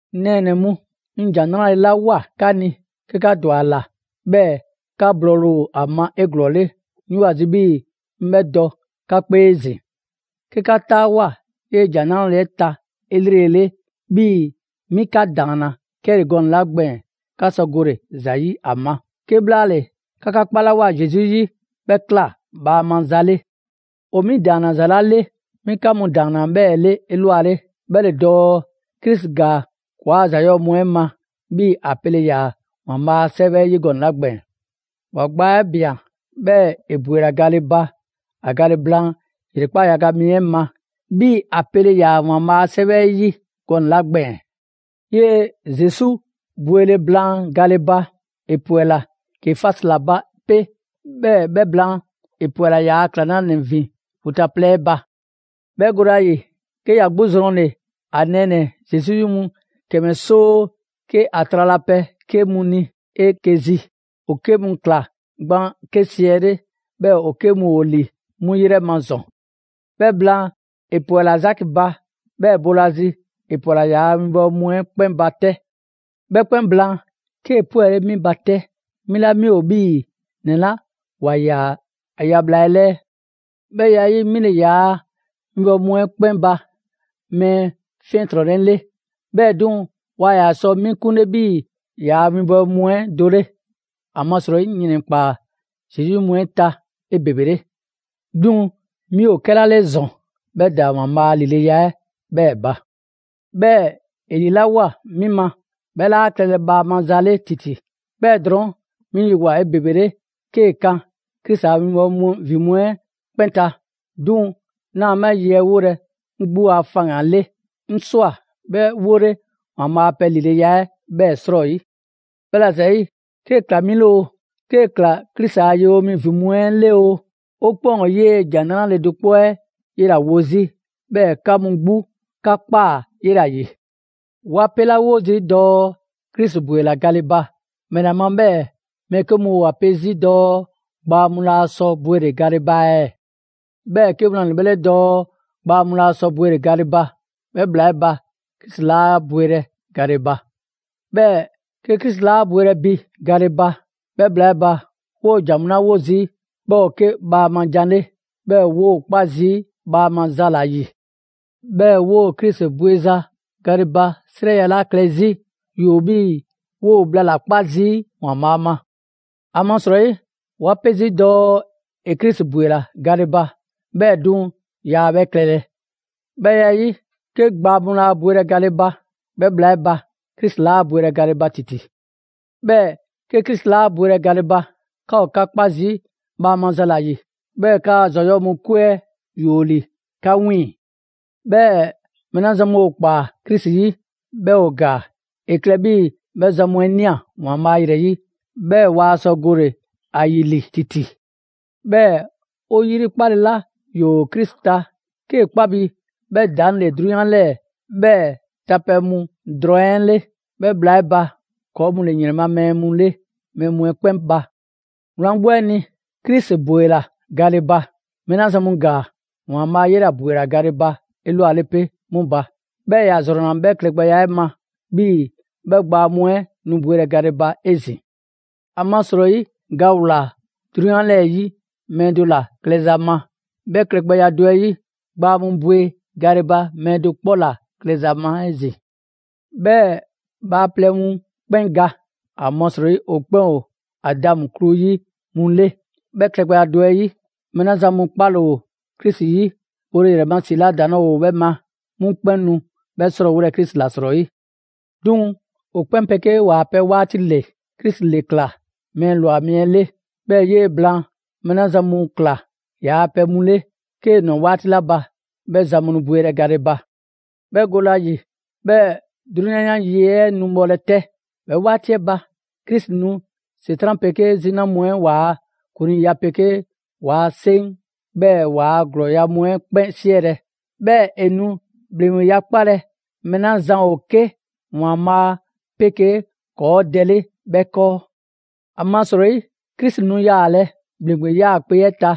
'Ŋ nɛɛnɛ‑ mu, 'ŋ ‑Jan 'Nrale‑ 'la ꞊woa 'ka ni 'ke 'ka ‑dwa ‑a ‑la, 'bhɛɛ‑ 'ka blɔɔle ‑o ‑a ma 'eglɔɔle, 'ŋ 'yoo‑ ‑a zi 'bhii‑ 'ŋ 'bhɛ dɔ 'ka 'kpee 'ezin‑. 'Ke 'ka 'taawoa꞊ 'yee‑ ‑Jan 'Nrale‑ 'ɛ ta 'elrele 'bhii‑ 'mi 'ka ‑daanna 'kɛle‑ gɔnɛ‑ 'la gbɛɛn‑ 'ka sɔ gole‑ ‑za 'yi ‑a ma. 'Kebhlaale, 'ka 'ka 'kpalawoa Zesu 'yi, 'bhɛ ꞊kla bhaama za 'le. ‑O 'mi ‑daanna ‑za 'la 'le, 'mi 'ka mu ‑daanna 'bhɛɛ‑ 'le 'elwale, 'bhɛ ‑le dɔɔ: Krisi ‑gaa ‑kɔɔ' a ‑za 'yɔɔ‑ mu 'ɛ ma 'bhii‑ ‑a pele ‑yaa ‑Waanbhaa' a 'Sɛwɛ 'ɛ 'yi gɔnɛ‑ 'la gbɛɛn‑. ‑Wa gbaa 'ɛ ꞊bian, 'bhɛɛ‑ ‑e ‑bwela gale ba ‑a gale blaan ‑yrekpaa' yaga mi 'ɛ ma, 'bhii‑ ‑a pele ‑yaa ‑Waanbhaa' a 'Sɛwɛ 'ɛ 'yi gɔnɛ‑ 'la gbɛɛn‑. 'Yee‑ Zesu bwele blaan gale ba, ‑e ‑pwɛla Kefasi ‑la ba 'pe, 'bhɛɛ‑ 'bhɛ blaan, ‑e ‑pwɛla ‑yaa' ‑klaŋlanɛ ‑vin vu ta plɛ 'ɛ ba. 'Bhɛ gole ‑a ‑yi, 'ke ‑ya 'gbu zrɔnle‑ ‑a nɛɛnɛ‑ Zesu 'yi mu ‑kɛmɛ 'soo 'ke ‑a tralapɛ 'ke mu ni 'eke‑ zi: ‑o 'ke mu ‑kla gban 'ke siɛle, 'bhɛɛ‑ ‑o 'ke mu ‑o ‑li 'mu ‑yrɛ ma ‑zɔn. 'Bhɛ blaan, ‑e ‑pwɛla Zaki ba, 'bhɛɛ‑ boolazi ‑e ‑pwɛla ‑yaa' winbɔwo mu 'ɛ 'kpɛn ba 'tɛ. 'Bhɛ 'kpɛn blaan, 'kee‑ 'pwɛle 'mi ba 'tɛ, 'mi 'la 'mi ‑o 'bhii‑ ‑nɛ 'la ‑wa ‑yaa ‑a ya bhla 'ɛ 'lɛɛ. 'Bhɛ ya 'ɛ 'yi, 'mi ‑le ‑yaa' winbɔwo mu 'ɛ 'kpɛn ba mɛɛ 'fiɛntrɔnnɛ 'le. 'Bhɛɛ‑ 'duŋ‑ waa ‑yaa sɔ 'mi 'kunle 'bhii‑ ‑yaa' winbɔwo mu 'ɛ do 'le; ‑amasrɔyi 'ŋ ‑yrɛnkpaa Zesu 'yi mu 'ɛ ta 'ebebele. 'Duŋ‑ 'mi ‑o 'kɛla 'le ‑zɔn 'bhɛ ‑daa ‑Waanbhaa' a ‑lileya 'ɛ 'bhɛɛ‑ ba. 'Bhɛɛ‑ ‑e ‑lilawoa 'mi ma 'bhɛ 'laa klɛlɛ bhaama za 'le ‑titi: 'bhɛɛ‑ drɔɔn' 'mi yewoa‑ 'ebebele 'kee‑ kan Krisi a winbɔwo mu ‑vin mu 'ɛ 'kpɛn ta. 'Duŋ‑ 'naa 'bhɛ ye 'ɛ 'wolɛ‑ 'ŋ 'gbu a faŋgan‑ 'le, 'ŋ ꞊swa 'bhɛ 'wole ‑Waanbhaa' a pɛ ‑lileya 'ɛ 'bhɛɛ‑ 'srɔyi. 'Bhɛla‑ ‑zayi', 'kee‑ ꞊kla 'mi 'le oo, 'kee‑ ꞊kla Krisi a 'winbɔwo mu ‑vin mu 'ɛ 'le oo, 'o 'kpɛn ‑o 'yee‑ ‑Jan 'Nrale‑ do 'kpɔ 'ɛ 'yela‑ wo 'zi, 'bhɛɛ‑ 'ka mu 'gbu 'ka ꞊kpaa 'yela ‑yi. 'Wa 'pelawo zii' dɔɔ Krisi ‑bwela gale ba; ‑mɛla ma 'bhɛɛ‑ mɛɛ 'ke mu ‑o ‑a pe 'zi dɔɔ gbaa mu laa sɔ bwele‑ gale ba ɛɛ? 'Bhɛɛ‑ 'ke wlan ‑le 'bhɛ 'le dɔɔ gbaa mu laa sɔ bwele‑ gale ba, 'bhɛ bhla 'ɛ ba Krisi 'laa bwelɛ gale ba. 'Bhɛɛ‑ 'ke Krisi 'laa bwelɛ bi gale ba, 'bhɛ bhla 'ɛ ba 'woo‑ ‑jan 'la 'wo zii' 'bhɛ ‑o 'ke bhaama jan 'le, 'bhɛɛ‑ 'woo 'kpa zii' bhaama za ‑la ‑yi. 'Bhɛɛ‑ 'woo‑ Krisi bweza gale ba 'srɛya‑ 'la klɛ 'zi, ‑yoo 'bhii‑ 'woo‑ bhla ‑la 'kpa zii' ‑Waanbhaa' ma. ‑Amasrɔyi 'wa 'pe zii' dɔɔ ‑e Krisi ‑bwela gale ba, 'bhɛɛ‑ 'duŋ‑ yaa 'bhɛ klɛlɛ. 'Bhɛ ya 'ɛ 'yi, 'ke gbaa mu laa bwelɛ gale ba, 'bhɛ bhla 'ɛ ba, Krisi 'laa bwelɛ gale ba ‑titi. 'Bhɛɛ‑ 'ke Krisi 'laa bwelɛ gale ba; 'ka ‑o 'ka 'kpa zii' bhaama za ‑la ‑yi. 'Bhɛɛ‑ 'kaa‑ ‑za 'yɔɔ‑ mu 'kwe 'ɛ ‑yoo ‑li 'ka 'wiiŋ‑. 'Bhɛɛ‑ mɛɛ 'la zan mu ‑o ꞊kpaa Krisi 'yi, 'bhɛɛ‑ ‑o ‑gaa, ‑e klɛ 'bhii‑ 'bhɛ zan mu ꞊nia ‑Waanbhaa' ‑yrɛ 'yi 'bhɛɛ‑ waa sɔ gole‑ ‑a ‑yi ‑li ‑titi. 'Bhɛɛ‑ 'o 'yri 'kpale‑ 'la ‑yoo Krisi ta 'kee‑ 'kpa bi 'bhɛ ‑daŋ' ‑le 'drunyan 'lɛɛ‑ 'bhɛɛ‑ ta pɛ mu drɔŋ 'ɛ 'le, 'bhɛ bhla 'ɛ ba, ‑kɔɔ' mu ‑le ‑yrɛn ma mɛɛ mu 'le mɛɛ mu 'ɛ 'kpɛn ba. Wlan 'gbu 'ɛ ni, Krisi ‑bwela gale ba. Mɛɛ 'la zan mu ‑gaa, ‑Waanbhaa' 'yela‑ ‑bwela gale ba 'elwale 'pe 'mu ba. 'Bhɛɛ‑ ‑ya ‑zrɔnna 'bhɛ klɛgbɛya 'ɛ ma, 'bhii‑ 'bhɛ gbaa mu 'ɛ nu bwelɛ gale ba 'ezin‑. ‑Amasrɔyi ga ‑wlaa 'drunyan 'lɛɛ‑ 'yi mɛɛ do ‑la klɛza ma; 'bhɛ klɛgbɛya do 'ɛ 'yi, gbaa mu bwe gale ba mɛɛ do 'kpɔ ‑la klɛza ma 'ezin‑. 'Bhɛɛ‑ bhaaplɛŋ mu 'kpɛn ga, ‑amasrɔyi ‑o 'kpɛn ‑o Adamu klu 'yi mu 'le, 'bhɛ klɛgbɛya do 'ɛ 'yi, mɛɛ 'la zan mu 'kpale‑ ‑o Krisi 'yi, bole ‑yrɛ ma ‑si 'la 'ke ‑daŋ' 'laa ‑o 'bhɛ ma, 'mu 'kpɛn nu 'bhɛ 'srɔɔwolɛ Krisi ‑la 'srɔyi. 'Duŋ‑ ‑o 'kpɛn 'pegee ‑waa pɛ 'waati ‑le: Krisi ‑le ꞊kla mɛɛ ꞊lwa mi 'ɛ 'le; 'bhɛɛ‑ 'yee‑ blaan, mɛɛ 'la zan mu ꞊kla ‑yaa' pɛ mu 'le, 'kee‑ ꞊nwa 'waati 'la ba, 'bhɛ zan mu nu bwelɛ gale ba. 'Bhɛ gole ‑a ‑yi, 'bhɛɛ‑ 'drunyan 'yan yi 'ɛ nu bhɔlɛ 'tɛ. 'Bhɛ 'waati 'ɛ ba, Krisi nu ‑Setran' 'pegee 'zina mu 'ɛ ‑waa ‑kuŋliiya 'pegee ‑waa' 'seŋ, 'bhɛɛ‑ ‑waa' ‑glɔɔya' mu 'ɛ 'kpɛn 'siɛlɛ‑. 'Bhɛɛ‑ ‑e nu ‑bhleŋgbeya 'kpalɛ‑ mɛɛ 'la zan ‑o 'ke ‑Waanbhaa 'pegee ‑kɔɔ' Dɛ 'le 'bhɛ 'kɔɔ. ‑Amasrɔyi Krisi nu yaalɛ ‑bhleŋgbe 'yaakpe‑ 'ɛ ta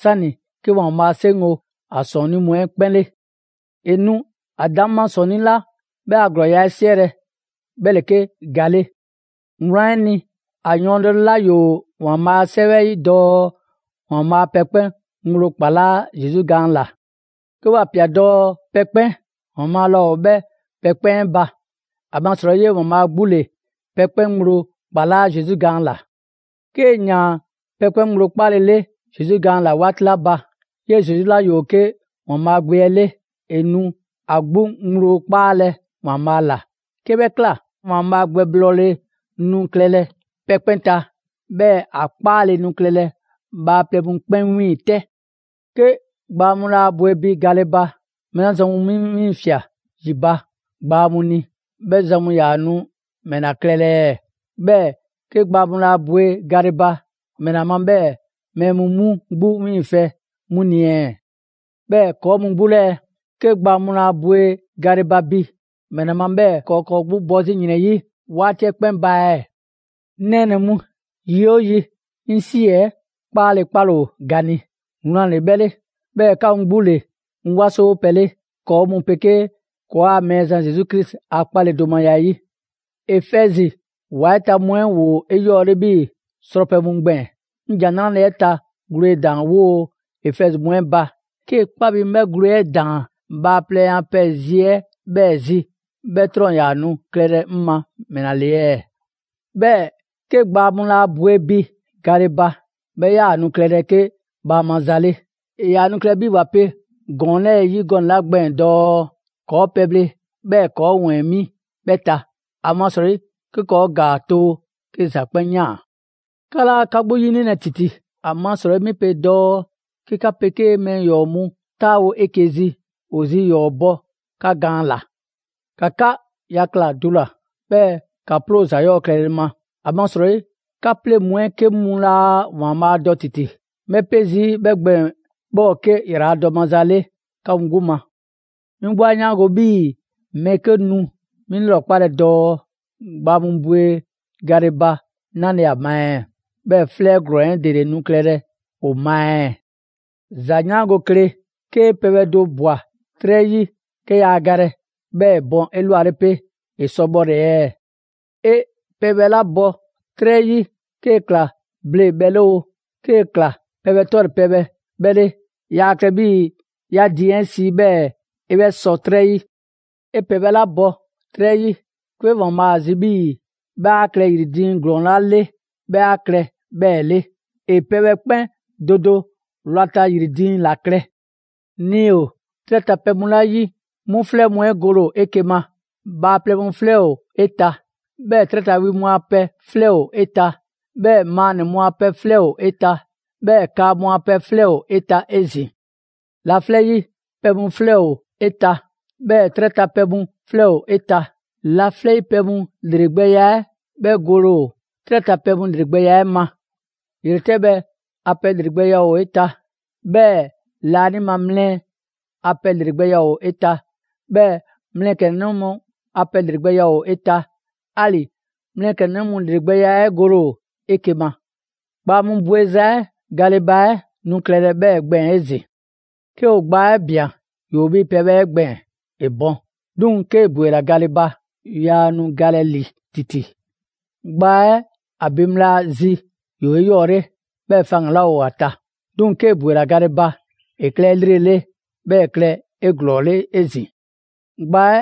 'sani 'ke ‑Waanbhaa' 'seŋgo‑ ‑a ‑sɔɔnnii' mu 'ɛ 'kpɛn 'le. ‑E nu ‑a ‑daŋma' ‑sɔɔnnii 'la 'bhɛ a ‑glɔɔya' 'ɛ 'siɛlɛ‑, 'bhɛ ‑le 'ke ga 'le. Wlan 'ɛ ni, ‑a yɔɔndɛle 'la ‑yoo ‑Waanbhaa' a 'Sɛwɛ 'ɛ 'yi dɔɔ: «‑Waanbhaa' pɛ 'kpɛn ŋgblo ‑kpalaa' Zesu gaan ‑la.» 'Ke ‑wa ꞊pia dɔɔ «pɛ 'kpɛn», ‑Waanbhaa' laa ‑o 'bhɛ pɛ 'kpɛn 'ɛ ba. ‑Amasrɔyi 'yee‑ ‑Waanbhaa' 'gbu ‑le pɛ 'kpɛn ŋgblo ‑kpalaa' Zesu gaan ‑la. 'Kee‑ ‑yaan pɛ 'kpɛn ŋgblo 'kpaalele Zesu gaan ‑la 'waati 'la ba, 'yee‑ Zesu 'la ‑yoo 'ke ‑Waanbhaa' Gbe 'ɛ 'le, ‑e nu ‑a 'gbu ŋgblo 'kpaalɛ‑ ‑Waanbhaa' ‑la. 'Ke 'bhɛ ꞊kla, ‑Waanbhaa' gbɛblɔɔle nu klɛlɛ pɛ 'kpɛn ta, 'bhɛɛ‑ ‑a 'kpaale‑ nu klɛlɛ bhaaplɛŋ mu 'kpɛn 'wiiŋ‑ 'tɛ. 'Ke gbaa mu laa bwe bi gale ba, mɛɛ 'la zan mu 'mu wiiŋfɛ' ‑yi ba gbaa mu ni, 'bhɛ zan mu ‑yaa nu ‑mɛ ‑la klɛlɛ ɛɛ? 'Bhɛɛ‑ 'ke gbaa mu 'laa bwe gale ba, ‑mɛla ma 'bhɛɛ‑ mɛɛ mu 'mu 'gbu 'wiiŋfɛ‑ 'mu ni ɛɛ? 'Bhɛɛ‑ ‑kɔɔ' mu 'gbu 'lɛɛ‑ ɛɛ? 'Ke gbaa mu laa bwe gale ba bi, ‑mɛla ma 'bhɛɛ‑ ‑kɔɔ' ‑o ‑kɔɔ' 'gbu bɔ 'zi ‑yrɛn 'yi 'waati 'ɛ 'kpɛn ba ɛɛ? 'Ŋ nɛɛnɛ‑ mu, yi 'oo yi, 'ŋ ‑si 'ɛ 'kpaakpale ‑o ga ni, wlan ‑le 'bhɛ 'le. 'Bhɛɛ‑ 'ka mu 'gbu ‑le 'ŋ 'wasowo pɛ 'le ‑kɔɔ' mu 'pegee ‑kɔɔa' Mɛɛzan Zesu Krisi a 'kpaledomaya 'ɛ 'yi. Efɛzi ‑wa 'ɛ ta mu 'ɛ ‑woo 'eyɔɔle 'bhii‑ srɔpɛ mu 'ɛ gbɛɛn‑. 'Ŋ ‑Jan 'Nrale‑ 'ɛ ta gwledaan‑ 'woo‑ Efɛzi mu 'ɛ ba, 'kee‑ 'kpa bi 'ŋ 'bhɛ gwle 'ɛ ꞊daan bhaaplɛŋ a pɛ zi 'ɛ 'bhɛɛ‑ zi, 'bhɛ 'trɔn 'yaa‑ nu klɛlɛ 'ke ‑mɛla ‑le ɛɛ? 'Bhɛɛ‑ 'ke gbaa mu laa bwe bi gale ba, 'bhɛ 'yaa‑ nu klɛlɛ 'ke bhaama za 'le. ‑E ‑yaa nu klɛlɛ 'bhii‑ ‑wa pe ‑gɔɔn 'lɛɛ‑ 'yi gɔnɛ‑ 'la gbɛɛn‑ dɔɔ: «‑Kɔɔ' pɛbhle, 'bhɛɛ‑ ‑kɔɔ' ‑wɛɛn mi 'bhɛ ta; ‑amasrɔyi 'ke ‑kɔɔ' ‑gaa too 'ke ‑za 'kpɛn ꞊yaan.» 'Ka 'laa 'ka 'gbu 'yinilɛ ‑titi! ‑Amasrɔyi 'mi pe dɔɔ: «'Ke 'ka 'pegee mɛɛ ‑yɔɔ' mu 'taawo‑ 'eke‑ zi, ‑o zi ‑yɔɔ' bɔ 'ka gaan ‑la.» ‑Ka 'ka yakla‑ dula‑, 'bhɛɛ‑ ‑ka 'ploo‑ ‑za 'yɔɔ‑ klɛle ma, ‑amasrɔyi 'ka 'pleŋ‑ mu 'ɛ 'ke mu laa ‑Waanbhaa' dɔ ‑titi‑. 'Ŋ 'bhɛ 'pe zii' 'bhɛ gbɛɛn‑ 'bhɛ ‑o 'ke ‑yraladɔ maza 'le 'ka mu 'gbu ma. 'Mi 'gbu 'a 'yaango‑ 'bhii‑ mɛɛ 'ke nu 'mi 'lrɔkpalɛ dɔɔ: «Gbaa mu bwe gale ba 'nale‑ ‑a ma ɛɛ? 'Bhɛɛ‑ 'flɛ ‑glɔɔn 'ɛ ‑dele nu klɛlɛ ‑o ma ɛɛ?» ‑Za 'yaango‑ kle! 'Kee pɛbhɛ do ꞊bwa 'trɛ 'yi, 'ke yaa galɛ, 'bhɛɛ‑ ‑e bɔn 'elwale 'pe, ‑e sɔ bhɔle‑ ɛɛ? 'E pɛbhɛ 'la bɔ 'trɛ 'yi, 'kee‑ ꞊kla ble bhɛ 'le oo, 'kee‑ ꞊kla pɛ 'tɔle‑ pɛbhɛ 'bhɛ 'le, 'yaa klɛ 'bhii‑ 'ya ‑a diiŋ 'ɛ si 'bhɛɛ‑ 'e 'bhɛ sɔ 'trɛ 'yi. 'E pɛbhɛ 'la bɔ 'trɛ 'yi, 'ke ‑Waanbhaa' a zi 'bhii‑ 'bhɛ 'a klɛ ‑yri diiŋ ‑glɔɔn 'la 'le 'bhɛ 'a klɛ 'bhɛɛ‑ 'le. ‑E pɛbhɛ 'kpɛn do do wlata ‑yri diiŋ ‑la klɛ. Nii‑ ‑o 'trɛ ta pɛ mu 'la 'yi 'mu 'flɛ mu 'ɛ gole 'eke‑ ma: bhaaplɛŋ mu 'flɛ ‑o 'eta‑, 'bhɛɛ‑ 'trɛ ma wi mu a pɛ 'flɛ ‑o 'eta‑, 'bhɛɛ‑ maannɛ‑ mu a pɛ 'flɛ ‑o 'eta‑, 'bhɛɛ‑ kaa mu a pɛ 'flɛ ‑o 'eta‑ 'ezin‑. Laflɛ' 'yi pɛ mu 'flɛ ‑o 'eta‑; 'bhɛɛ‑ 'trɛ ta pɛ mu 'flɛ ‑o 'eta‑. Laflɛ' 'yi pɛ mu ‑lregbɛya 'ɛ 'bhɛ gole ‑o 'trɛ ta pɛ mu ‑lregbɛya 'ɛ ma. ‑Yretɛbhɛ a pɛ ‑lregbɛya ‑o 'eta‑, 'bhɛɛ‑ laanima mlɛ a pɛ ‑lregbɛya ‑o 'eta‑; 'bhɛɛ‑ mlɛklɛnnɛ mu a pɛ ‑lregbɛya ‑o 'eta‑; 'ali‑ mlɛklɛnnɛ mu ‑lregbɛya 'ɛ gole ‑o 'eke‑ ma. Gbaa mu bweza 'ɛ gale ba 'ɛ nu klɛlɛ 'bhɛɛ‑ gbɛɛn‑ 'ezin‑. 'Ke ‑o gbaa 'ɛ ꞊bian, ‑yoo 'bhii‑ pɛbhɛ 'ɛ gbɛɛn‑, ‑e bɔn. 'Duŋ‑ 'kee‑ ‑bwela gale ba, yaa nu galɛ ‑li ‑titi. Gbaa 'ɛ ‑a bin bhla zi ‑yoo 'eyɔɔle, 'bhɛɛ‑ faŋgan‑ 'laa ‑o ‑a ta. 'Duŋ‑ 'kee‑ ‑bwela gale ba, ‑e klɛ 'elrele, 'bhɛɛ‑ ‑e klɛ 'eglɔɔle 'ezin‑. Gbaa 'ɛ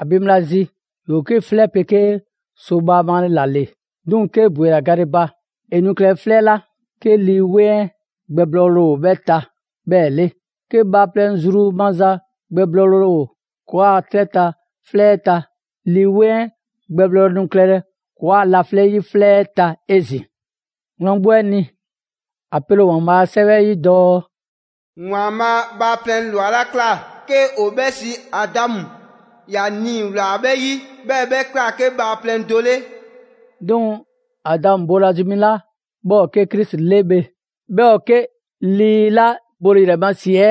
‑a bin bhla zi, ‑yoo 'ke 'flɛ 'pegee so bhaama ‑la ‑le. 'Duŋ‑ 'kee‑ ‑bwela gale ba, ‑e nu klɛlɛ 'flɛ 'la 'ke Lii 'Weŋ 'ɛ gbɛblɔɔle ‑o 'bhɛ ta 'bhɛɛ‑ 'le. 'Ke bhaaplɛŋ zru maza gbɛblɔɔle ‑o ‑kɔɔa' 'trɛ ta 'flɛ 'ɛ ta, Lii 'Weŋ 'ɛ gbɛblɔɔle nu klɛlɛ ‑kɔɔa' laflɛ' 'yi 'flɛ 'ɛ ta 'ezin‑. Wlan 'gbu 'ɛ ni, ‑a pele ‑o ‑Waanbhaa' a 'Sɛwɛ 'ɛ 'yi dɔɔ: «‑Waanbhaa' bhaaplɛŋ ‑lwa 'la ꞊kla 'ke ‑o 'bhɛ siiAdamu, ‑ya nii‑ ‑wlaa 'bhɛ 'yi, 'bhɛɛ‑ 'bhɛ ‑kla 'ke bhaaplɛŋ do 'le.» 'Duŋ‑ Adamu boolazi mi 'la 'bhɛ ‑o 'ke Krisi 'le bhe, 'bhɛ ‑o 'ke Lii 'la bole ‑yrɛ ma ‑si 'ɛ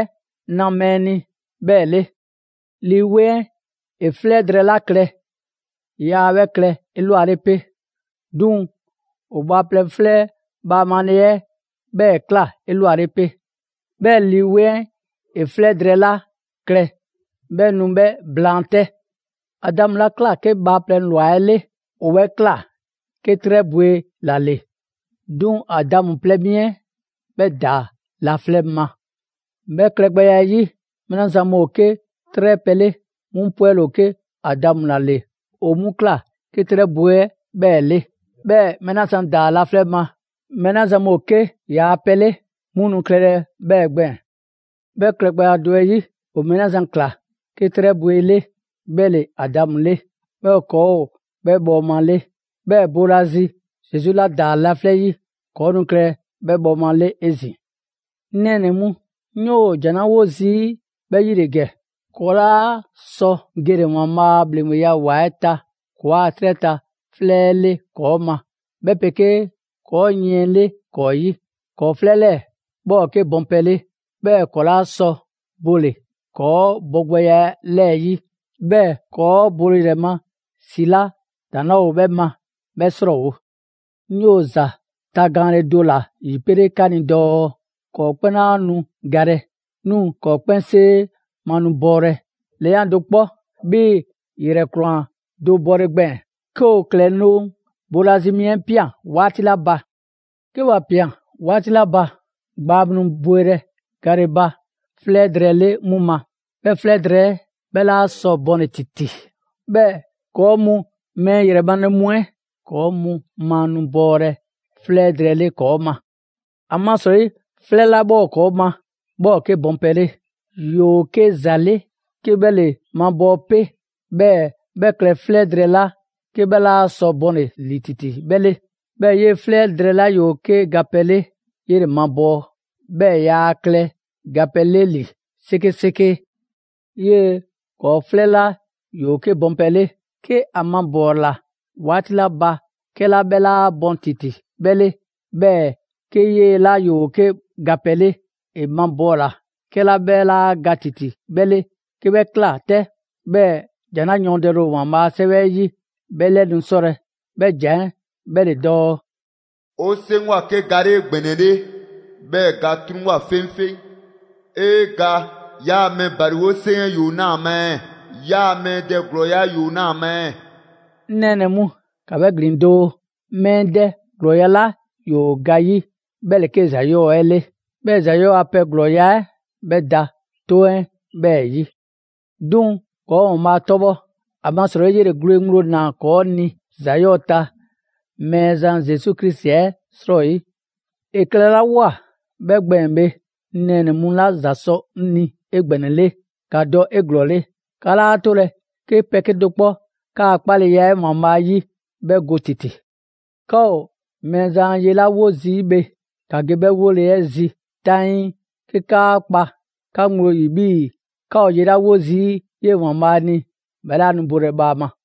na mɛɛ ni 'bhɛɛ‑ 'le. Lii 'Weŋ 'ɛ ‑e 'flɛ drɛɛ 'la klɛ, yaa 'bhɛ klɛlɛ 'elwale 'pe, 'duŋ‑ ‑o bhaaplɛŋ 'flɛ bhaamale 'ɛ 'bhɛɛ‑ ꞊kla 'elwale 'pe. 'Bhɛɛ‑ Lii 'Weŋ 'ɛ ‑e 'flɛ drɛɛ 'la klɛ 'bhɛ nu 'bhɛ blaan 'tɛ. Adamu 'la ꞊kla 'ke bhaaplɛŋ ‑lwa 'ɛ 'le, ‑o 'bhɛ ꞊kla 'ke 'trɛ bwe ‑la ‑le; 'duŋ‑ Adamu plɛ mi 'ɛ 'bhɛ ‑daa laflɛ' ma. 'Bhɛ klɛgbɛya 'ɛ 'yi, mɛɛ 'la zan mu ‑o 'ke 'trɛ pɛ 'le, 'mu 'pwɛle‑ ‑o 'ke Adamu 'la ‑o 'bhɛ ꞊kla 'ke 'trɛ bwe 'le 'bhɛɛ‑ 'le. 'Bhɛɛ‑ mɛɛ 'la zan ‑daa laflɛ' ma, ‑yoo gɔnɛ‑ 'la gbɛɛn‑, mɛɛ 'la zan mu ‑o 'ke ‑yaa' pɛ 'le 'mu nu klɛlɛ 'bhɛɛ‑ gbɛɛn‑. 'Bhɛ klɛgbɛya do 'ɛ 'yi, ‑o mɛɛ 'la zan ꞊kla 'ke 'trɛ bwe 'le 'bhɛ ‑le Adamu 'le. 'Bhɛɛ‑ ‑kɔɔ' ‑o 'bhɛ bhɔɔma 'le. 'Bhɛɛ‑ boolazi Zesu 'la ‑daa laflɛ' 'yi, 'kɔɔ‑ nu klɛlɛ 'bhɛ bhɔɔma 'le 'ezin‑. 'Ŋ nɛɛnɛ‑ mu, 'ŋ 'yoo‑ ‑jan 'la 'wo zii' 'bhɛ 'yi ‑le ‑gɛ: ‑kɔɔ' 'laa sɔ gele‑ ‑Waanbhaa' a ‑bhleŋgbeya ‑wa 'ɛ ta ‑kɔɔa' 'trɛ ta 'flɛ 'ɛ 'le ‑kɔɔ' ma, 'bhɛ 'pegee ‑kɔɔ' yiɛn 'le ‑kɔɔ' 'yi. ‑Kɔɔ' 'flɛ 'lɛɛ‑ 'bhɛ ‑o 'ke bɔn pɛ 'le; 'bhɛɛ‑ ‑kɔɔ' 'laa sɔ bole‑ ‑kɔɔ' bogbɛya 'lɛɛ‑ 'yi, 'bhɛɛ‑ ‑kɔɔ' bole ‑yrɛ ma ‑si 'la ‑daŋ' 'laa ‑o 'bhɛ ma, 'bhɛ 'srɔɔwo‑. 'Ŋ 'yoo‑ ‑za tagaanle do ‑la ‑yipele 'ka ni dɔɔ: ‑Kɔɔ' 'kpɛn 'laa nu galɛ, 'duŋ‑ ‑kɔɔ' 'kpɛnsee ma nu bɔɔlɛ, ‑lɛyan' do 'kpɔ 'bhii‑ ‑yrɛkwlan do bɔle gbɛɛn‑, 'ke ‑o ‑klɛloŋ' boolazi mi 'ɛ ꞊pian 'waati 'la ba. 'Ke ‑wa ꞊pian 'waati 'la ba, gbaa mu nu bwelɛ gale ba 'flɛ drɛɛ 'le 'mu ma, 'bhɛ 'flɛ drɛɛ 'ɛ 'bhɛ 'laa sɔ bɔnle‑ ‑titi. 'Bhɛɛ‑ ‑kɔɔ' mu mɛɛ ‑yrɛ male mu 'ɛ, ‑kɔɔ' mu ma nu bɔɔlɛ 'flɛ drɛɛ 'le ‑kɔɔ' ma. ‑Amasrɔyi 'flɛ 'la 'bhɛ ‑o ‑kɔɔ' ma, 'bhɛ ‑o 'ke bɔnpɛ 'le. ‑Yoo 'ke ‑za 'le 'ke 'bhɛ ‑le mabɔɔ 'pe, 'bhɛɛ‑ 'bhɛ klɛ 'flɛ drɛɛ 'la 'ke 'bhɛ 'laa sɔ bɔnle‑ ‑li ‑titi 'bhɛ 'le. 'Bhɛɛ‑ 'yee‑ 'flɛ 'la ‑yoo 'ke gapɛ 'le, 'yele‑ mabɔɔ, 'bhɛɛ‑ yaa klɛ gapɛ 'le ‑li 'sekeseke. 'Yee‑ ‑kɔɔ' 'flɛ 'la ‑yoo 'ke bɔnpɛ 'le, 'ke ‑a mabɔɔla 'waati 'la ba 'kɛla 'bhɛ 'laa bɔn ‑titi 'bhɛ 'le, 'bhɛɛ‑ 'ke 'yee‑ 'la ‑yoo 'ke gapɛ 'le, ‑e mabɔɔla 'kɛla 'bhɛ 'laa ga ‑titi 'bhɛ 'le, 'ke 'bhɛ ꞊kla 'tɛ, 'bhɛɛ‑ ‑jan 'la yɔɔndɛle ‑o ‑Waanbhaa' a 'Sɛwɛ 'ɛ 'yi 'bhɛ 'lɛ nu 'sɔlɛ‑, 'bhɛ ‑jan 'ɛ 'bhɛ ‑le dɔɔ: «‑O 'seŋgwa‑ 'ke ga 'le 'egbɛnɛle, 'bhɛɛ‑ ga 'truŋwoa꞊ 'feŋfeŋ!» «'Ee ga! 'Yaa‑ mɛɛ ‑baliwo 'seŋ 'ɛ ‑yoo 'naa‑ ‑a ma ɛɛ? 'Yaa‑ mɛɛ dɛ ‑glɔɔya' 'ɛ ‑yoo 'naa‑ ɛɛ?» 'Ŋ nɛɛnɛ‑ mu, ‑ka 'bhɛ ‑glin doo! Mɛɛ dɛ ‑glɔɔya' 'la ‑yoo ga 'yi 'bhɛ ‑le 'ke ‑za 'yɔɔ‑ 'ɛ 'le; 'bhɛɛ‑ ‑za 'yɔɔ‑ a pɛ ‑glɔɔya' 'ɛ 'bhɛ da 'toŋ 'ɛ 'bhɛɛ‑ 'yi. 'Duŋ‑ ‑kɔɔ' ‑Waanbhaa' 'tɔbhɔ! ‑Amasrɔyi 'yele‑ gwle ŋgblo ꞊naa ‑kɔɔ' ni ‑za 'yɔɔ‑ ta Mɛɛzan Zesu Krisi 'ɛ 'srɔyi! ‑E klɛlawoa 'bhɛ gbɛɛn‑ bhe, 'ŋ nɛɛnɛ‑ mu 'la ‑za sɔ 'ŋ ni 'egbɛnɛle, ‑ka dɔ 'eglɔɔle, 'ka 'laa 'tolɛ‑ 'ke pɛ 'kedo‑ 'kpɔ 'kaa‑ 'kpaleya 'ɛ ‑Waanbhaa' 'yi 'bhɛ go ‑titi. 'Ka ‑o Mɛɛzan a ye 'la 'wo zii' bhe, ‑ka ge 'bhɛ 'wole‑ 'ɛ zi 'taŋii, 'ke 'kaa kpa 'ka ŋgblo ‑yi 'bhii‑ 'ka ‑o ye 'la 'wo zii' 'yee‑ Mɛɛzan ni, 'bhɛ 'laa nu bolɛ bhaama.